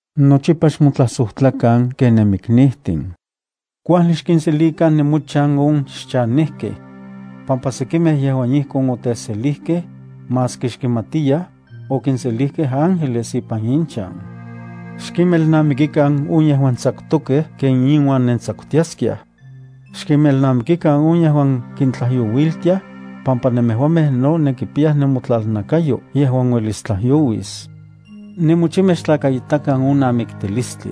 Nochipa xmotlajsojtlakan ken nenmiknijtin. Kuajli xkinselikan nemochan on xchanejkej. Pampa sekimej yejuan ijkon oteselijkej, maski xkimatiyaj, okinselijkej ángeles ipan inchan. Xkinmelnamikikan on yejuan tsakutokej ken inuan nentsakutiaskiaj. Xkinmelnamikikan on yejuan kintlajyouiltiaj, pampa nemejuamej no nenkipiyaj nemotlalnakayo yejuan uelis tlajyouis. Nemochimej xtlakaitakan on namiktilistli.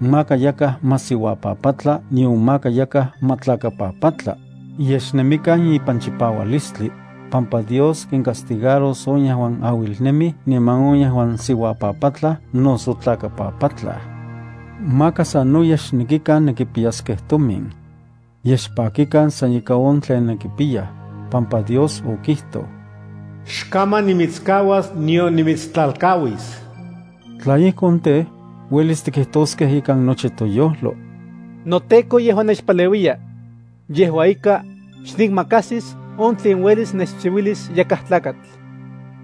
Maka yakaj ma siuapapatla nion maka yakaj ma tlakapapatla, yej xnemikan ipan chipaualistli, pampa Dios kincastigaros on yejuan auilnemij niman on yejuan siuapapatlaj noso tlakapapatlaj. Maka sanoyej xnekikan nenkipiyaskej tomin. Yej xpakikan san ika on tlen nenkipiyaj, pampa Dios okijtoj: “Xkaman nimitskauas nion nimitstlalkauis.” Tla ijkon tej, uelis tikijtoskej ikan nochi toyojlo: NoTEKO yejua nechpaleuiya. Yejua ika, xnikmakajsis on tlen uelis nechchiuilis yakaj tlakatl.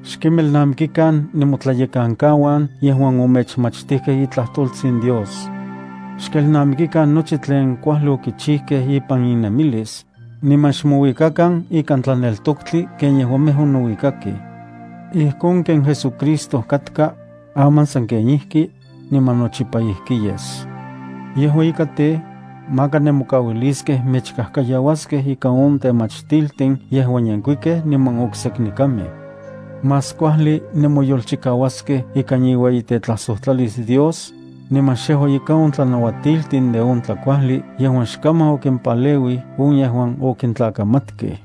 Xkinmelnamikikan nemotlayekankauan yejuan omechmachtijkej itlajtoltsin Dios. Xkelnamikikan nochi tlen kuajli okichijkej ipan innemilis, niman xmouikakan ikan tlaneltoktli ken yejuamej onouikakej. Ijkon ken JesuCristo katka, aman sanken ijki, niman nochipa ijki yes. Yejua ika tej, maka nemokauiliskej mechkajkayauaskej ika on temachtiltin yejuan yenkuikej niman okseknekamej. Más kuajli nenmoyolchikauaskej ikan iueyitetlajsojtlalis Dios, niman xejua ika on tlanauatiltin de on tlakuajli yejuan xkaman okimpaleuij on yejuan okintlakamatkej.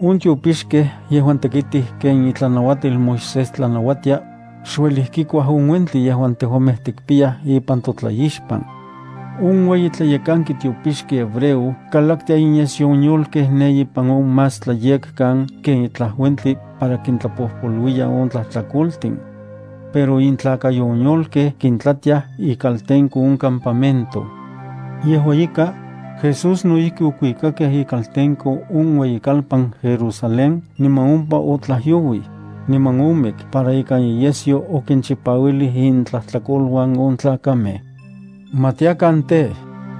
On tiopixkej yejuan tekitij ken itlanauatil Moisés tlanauatia, xueli kikuaj on uentli yejuan tejuamej tikpiyaj ipan totlaixpan. On ueyi tlayekanki tiopixki hebreo kalaktia inyesyo on yolkej ne ipan on Más Tlayekan ken itlaj uentli para kintlapojpoluiya on tlajtlakoltin. Pero intlakayo on yolkej kintlatiaj ikaltenko on campamento. Yejua ika, Jesús no ijki okuikakej ikaltenko on ueyikalpan Jerusalén niman ompa otlajyouij, niman omik para ikan iyesyo okinchipauilij intlajtlakoluan on tlakamej. Ma tiakan tej,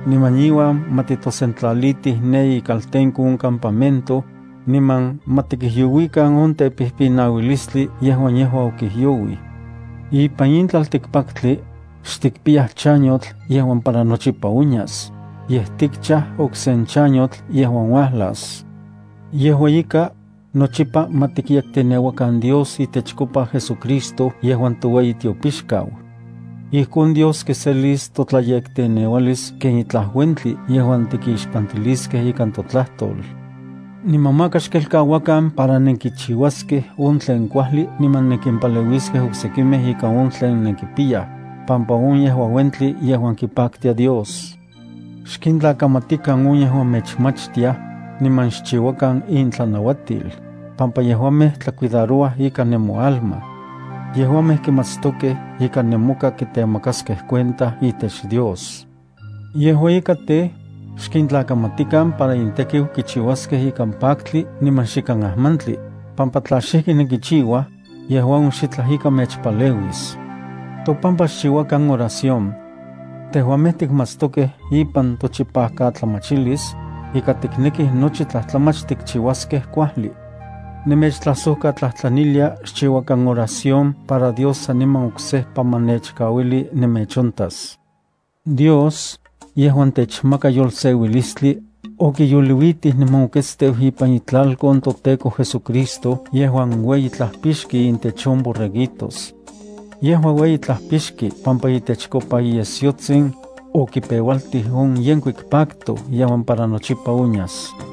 niman iuan ma titosentlalitij ne ikaltenko on campamento, niman ma tikijyouikan on tepijpinaualistli yejuan yejua okijyouij. Ipan in tlaltikpaktli, xtikpiyaj chanyotl yejuan para nochipa onyas, yej tikchaj okse chanyotl yejuan uajlas. Yejua ika, nochipa ma tikyekteneuakan Dios itechkopa JesuCristo yejuan toueyi tiopixkau. Ijkon Dios kiselis totlayekteneualis ken itlaj uentli yejuan tikixpantiliskej ikan totlajtol. Niman maka xkelkauakan para nenkichiuaskej on tlen kuajli niman nenkinpaleuiskej oksekimej ika on tlen nenkipiyaj, pampa on yejua uentli yejuan kipaktia Dios. Xkintlakamatikan on yejuan mechyekanaj, niman xchiuakan intlanauatil, pampa yejuamej tlacuidarouaj ikan nemoalma. Yejuamej kimatstokej ika nemoka kitemakaskej cuenta itech Dios. Yejua ika tej, xkintlakamatikan para intekiu kichiuaskej ikan paktli niman xikan ajmantli, pampa tla xijki nenkichiuaj, yejua on xitlaj ika mechpaleuis. Topampa xchiuakan oración. Tejuamej tikmatstokej ipan tochipajkatlamachilis, ika tiknekij nochi tlajtlamach tikchiuaskej kuajli. Nemechtlajsojkatlajtlanilia xchiuakan oración para Dios saniman oksejpa ma nechkauili nemechontas. Dios, yejuan techmaka yolseuilistli, okiyoliuitij niman okuiteu ipan itlalkon toTEKO JesuCristo yejuan ueyi Tlajpixki intech on borreguitos. Yejua ueyi Tlajpixki pampa itechkopa iyesyotsin, okipeualtij on yenkuik pacto yejuan para nochipa onyas.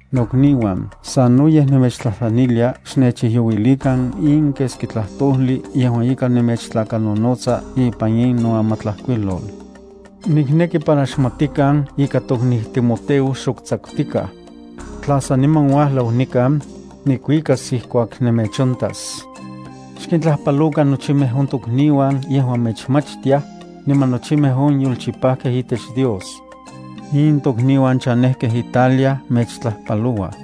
Nokniuan, sanoyej nemechtlajtlanilia xnechijyouilikan in keski tlajtojli yejuan ika nemechtlakanonotsa ipan in noamatlajkuilol. Nikneki para xmatikan ika tokniu Timoteo xok tsakutikaj. Tla saniman uajlau nikan, nikuikas ijkuak nemechontas. Xkintlajpalokan nochimej on tokniuan yejuan mechyekanaj, niman nochimej on yolchipajkej itech Dios. In tokniuan chanejkej Italia mechtlajpalouaj.